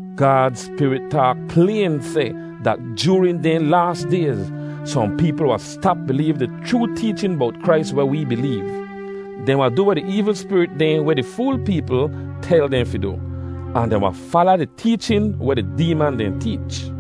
Gaad Spirit taak playn seh dat joorin dehn laas dayz, sohn peepl wahn stap bileev di chroo teechin bowt Krais weh wee bileev. Dehn wahn du weh di eevl spirit dehn weh di fool peepl tel dehn fi du, ahn dehn wahn fala di teechin weh di deeman dehn teech.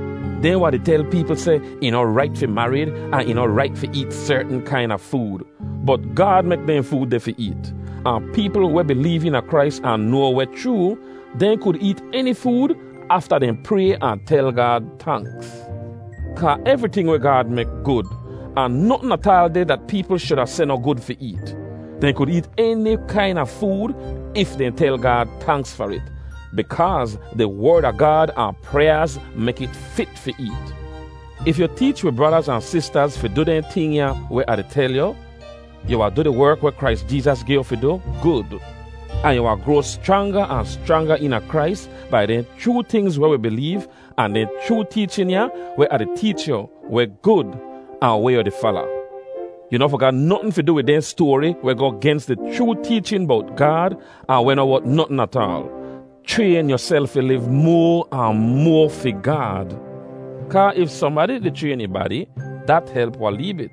Dehn wahn di tel peepl seh ih noh rait fi marid ahn ih noh rait fi eet sertn kaina food. Bot Gaad mek dehn food deh fi eet. Ahn peepl weh bileev eena Krais ahn noa weh chroo, dehn kud eet eni food afta dehn pray ahn tel Gaad tanks. Kaa evriting weh Gaad mek gud, ahn notn ataal deh dat peepl shuda seh noh gud fi eet. Dehn kud eet eni kaina food if dehn tel Gaad tanks far it, bikaaz di Werd a Gaad ahn pryaaz mek it fit fi eet. If yu teech wi bradaz ahn sistaz fi du dehn ting ya weh Ah di tel yu, yu wahn du di werk weh Krais Jeezas gi yu fi du gud. Ahn yu wahn groa schranga ahn schranga eena Krais bai dehn chroo tingz weh wi bileev ahn dehn chroo teechin ya weh Ah di teech yu, weh gud, ahn weh yu di fala. Yu noh fi ga notn fi du wid dehn stoari weh goh gens di chroo teechin bowt Gaad ahn weh noh wot notn ataal. Chrayn yuself fi liv moa ahn moa fi Gaad. Kaa if sohnbadi di chrayn ih badi, dat help wahn lee bit.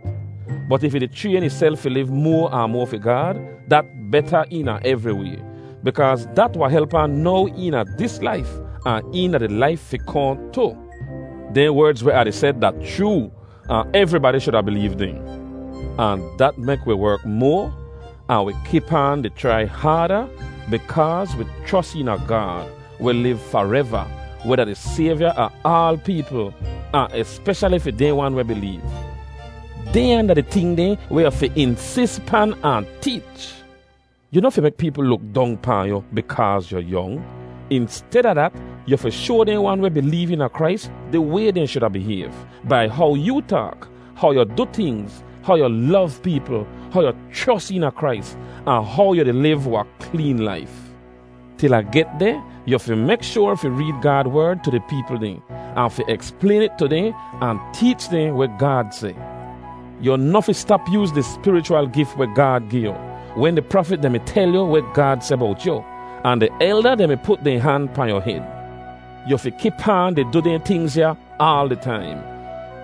Bot if ih di chrayn ihself fi liv moa ahn moa fi Gaad, dat beta eena evri way. Bikaaz dat wahn help ahn now eena dis laif, ahn eena di laif fi kohn tu. Dehn werdz weh Ah di seh da chroo, ahn evribadi shuda bileev dehn. Ahn dat mek wi werk moa, ahn wi kip aan di chrai haada, bikaaz wi chros eena Gaad, weh liv fareva, weh da di Sayvya a aal peepl, ahn espeshali fi dehn wan weh bileev. Dehnya da di ting dehn weh yu fi insis pan ahn teech. Yu noh fi mek peepl luk dong pahn yu bikaaz yu yong. Insteda dat, yu fi shoa dehn wan weh bileev eena Krais di way dehn shuda bihayv, bai how yoo taak, how yu du tingz, how yu lov peepl, how yu chros eena Krais, ahn how yu di liv wahn kleen laif. Til Ah get deh, yu fi mek shoar fi reed Gaad Werd tu di peepl dehn, ahn fi eksplayn it tu dehn ahn teech dehn weh Gaad seh. Yu noh fi stap yooz di spirichwal gif weh Gaad gi yu, wen di prafit dehn mi tel yu weh Gaad seh bowt yu, ahn di elda dehn mi put dehn han pahn yu hed. Yu fi kip aan di du dehn tingz ya aal di taim.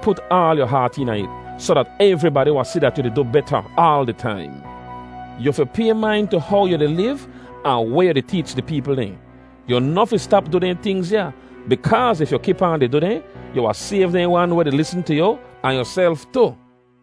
Put aal yu haat eena it, soh dat evribadi wahn si dat yu di du beta aal di taim. Yu fi pay main tu how yu di liv ahn weh yu di teech di peepl dehn. Yu noh fi stap du dehn tingz ya, bikaaz if yu kip aan di du dehn, yu wahn sayv dehn wan weh di lisn tu yu, ahn yuself tu.